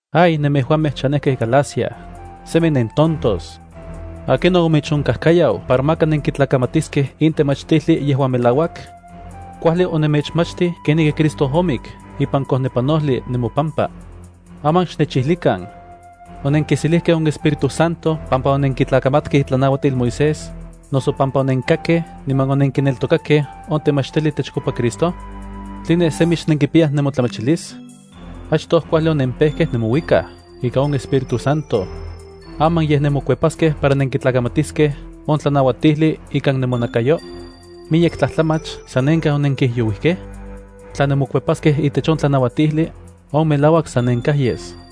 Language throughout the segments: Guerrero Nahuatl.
¡Ay, nemejuamej chanejkej Galacia, semi nentontos! ¿Akinon omechonkajkayau para maka nenkitlakamatiskej in temachtijli yejuan melauak? Kuajli onenmechmachtij kenijki Cristo omik ipan kojnepanojli nemopampa. Aman xnechijlikan, ¿onenkiselijkej on Espíritu Santo pampa onenkitlakamatkej itlanauatil Moisés, noso pampa onenkakkej niman onenkineltokakej on temachtijli itechkopa Cristo? ¿Tline semi xnenkipiyaj nemotlamachilis? Achtoj kuajli onempejkej nemouikaj ika on Espíritu Santo. ¿Aman yej nemokuepaskej para nenkitlakamatiskej on tlanauatijli ikan nemonakayo? ¿Miyek tlajtlamach sanenkaj onenkijyouijkej? Tla nemokuepaskej itech on tlanauatijli, on melauak sanenkaj yes.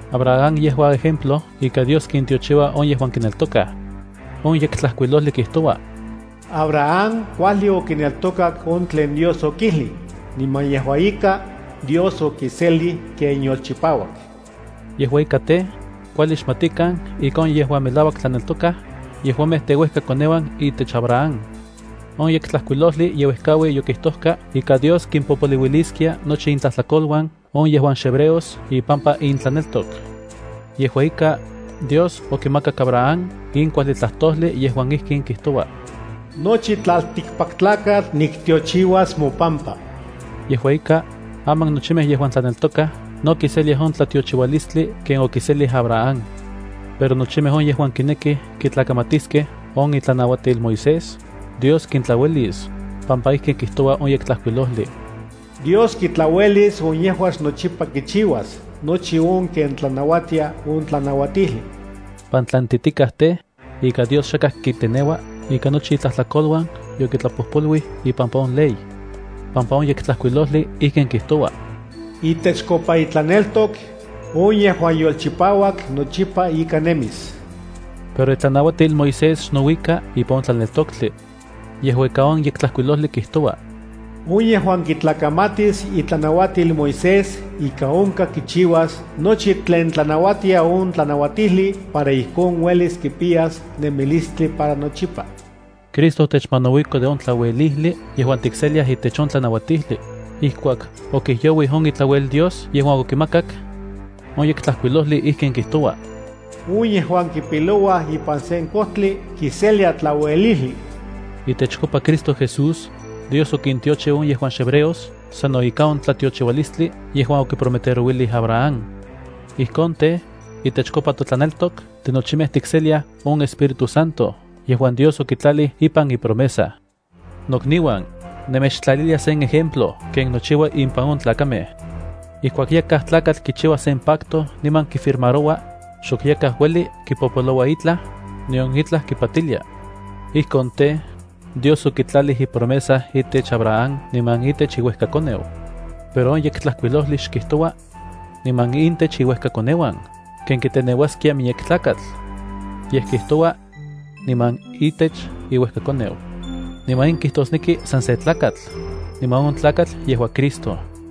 Abraham yejua ejemplo ika Dios kintiochiua on yejuan kineltokaj. On Yektlajkuilojli kijtoua: “Abraham kuajli okineltokak on tlen Dios okijlij, niman yejua ika, Dios okiselij ken yolchipauak.” Yejua ika tej, kuajli xmatikan ika on yejuan melauak tlaneltokaj, yejuamej teuejkakoneuan itech Abraham. On Yektlajkuilojli yeuejkaui yokijtojka ika Dios kimpopoliuiliskia nochi intlajtlakoluan on yejuan xhebreos ipampa intlaneltok. Yejua ika Dios okimakak in kuajli tlajtojli yejuan ijkin kijtoua: “Nochi tlaltikpaktlakatl niktiochiuas mopampa.” Yejua ika, aman nochimej yejuan tlaneltokaj no kiseliaj on tlatiochiualistli ken okiselij Abraham. Pero nochimej on yejuan kinekij kitlakamatiskej on itlanauatil Moisés, Dios kintlauelis, pampa ijki kijtoua on Yektlajkuilojli: “Dios kitlauelis on yejuan xnochipa kichiuas nochi on ken tlanauatia on tlanauatijli.” Pantlantitikaj tej, ika Dios xakaj kiteneua ika nochi itlajtlakoluan yokitlapojpoluij ipampa on ley: Pampa on yektlajkuilojli ijkin kijtoua: “Itechkopa itlaneltok, on yejuan yolchipauak nochipa ika nemis.” Pero itlanauatil Moisés xnouika ipan on tlaneltoktli. Yejua ika, on Yektlajkuilojli kijtoua: “On yejuan kitlakamatis itlanauatil Moisés ika onkaj kichiuas nochi tlen tlanauatia on tlanauatijli para ijkon uelis kipiyas nemilistli para nochipa.” Cristo otechmanauiko de on tlauelijli yejuan tikseliaj itech on tlanauatijli, ijkuak okijyouij on itlauelil Dios yejuan okimakak. On Yektlajkuilojli ijkin kijtoua: “On yejuan kipilouaj ipan sen kojtli kiselia tlauelijli.” Itechkopa Cristo Jesús, Dios okintiochiu on yejuan xhebreos sano ika on tlatiochiualistli yejuan okiprometerouilij Abraham. Ijkon tej, itechkopa totlaneltok tinochimej tikseliaj on Espíritu Santo yejuan Dios okitlalij ipan ipromesa. Nokniuan, nemechtlalilia sen ejemplo ken nochiua impan on tlakamej. Ijkuak yakaj tlakatl kichiua sen pacto niman kifirmaroua, xok yakaj ueli kipopoloua itlaj, nion itlaj kipatilia. Ijkon tej, Dios okitlalij ipromesa itech Abraham niman itech iuejkakoneu. Pero on Yektlajkuilojli xkijtoua: “niman intech iuejkakoneuan”, ken kiteneuaskia miyek tlakatl. Yej kijtoua: “niman itech iuejkakoneu”. Niman in kijtosneki san se tlakatl, niman on tlakatl yejua Cristo.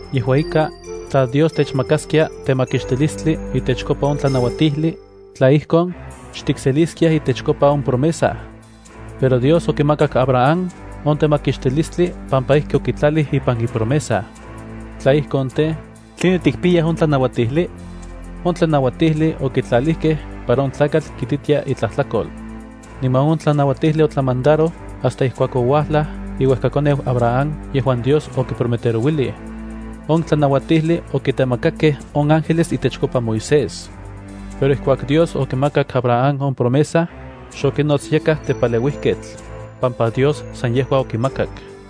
Yejua ika, tla Dios techmakaskia temakixtilistli itechkopa on tlanauatijli, tla ijkon, xtikseliskiaj itechkopa on promesa. Pero Dios okimakak Abraham on temakixtilistli pampa ijki okitlalij ipan ipromesa. Tla ijkon tej, ¿tline tikpiyaj on tlanauatijli? On tlanauatijli okitlalijkej para on tlakatl kititia itlajtlakol. Niman on tlanauatijli otlamandaroj hasta ijkuak ouajlaj iuejkakoneu Abraham yejuan Dios okiprometerouilij. On tlanauatijli okitemakakej on ángeles itechkopa Moisés. Pero ijkuak Dios okimakak Abraham on promesa, xokinots yakaj tepaleuijketl, pampa Dios san yejua okimakak.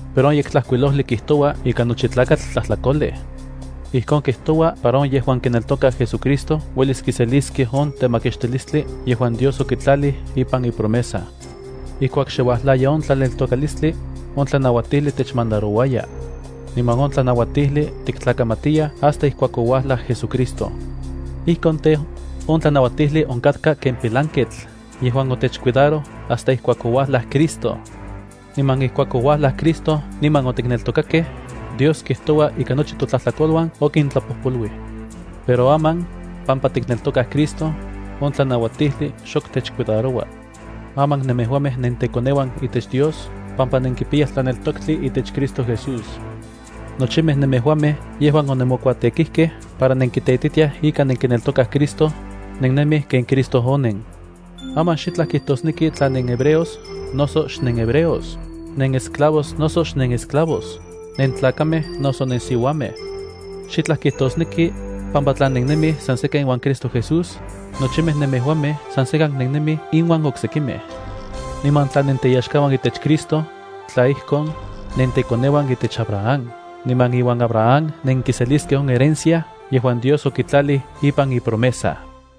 Pero on Yektlajkuilojli kijtoua ika nochi tlakatl tlajtlakolej. Ijkon kijtoua para on yejuan kineltokaj JesuCristo uelis kiseliskej on temakixtilistli yejuan Dios okitlalij ipan ipromesa. Ijkuak xe uajlaya on tlaneltokalistli, on tlanauatijli techmandarouaya. Niman on tlanauatijli tiktlakamatiyaj hasta ijkuak ouajlaj JesuCristo. Ijkon tej, on tlanauatijli onkatka ken pilanketl yejuan otechcuidaroj hasta ijkuak ouajlaj Cristo. Niman ijkuak ouajlaj Cristo niman otikneltokakej, Dios kijtoua ika nochi totlajtlakoluan okintlapojpoluij. Pero aman, pampa tikneltokaj Cristo, on tlanauatijli xok techcuidaroua. Aman nemejuamej nentekoneuan itech Dios pampa nenkipiyaj tlaneltoktli itech Cristo Jesús. Nochimej nemejuamej yejuan onemokuatekijkej para nenkiteititiaj ika nenkineltokaj Cristo, nennemij ken Cristo onen. Aman xitlaj kijtosneki tla nenhebreos noso xnenhebreos, nenesclavos noso xnenesclavos, nentlakamej noso nensiuamej. Xitlaj kijtosneki, pampa tla nennemij san sekan iuan Cristo Jesús, nochimej nemejuamej san sekan nennemij inuan oksekimej. Niman tla nenteyaxkauan itech Cristo, tla ijkon, nentekoneuan itech Abraham, niman iuan Abraham nenkiseliskej on herencia yejuan Dios okitlalij ipan ipromesa.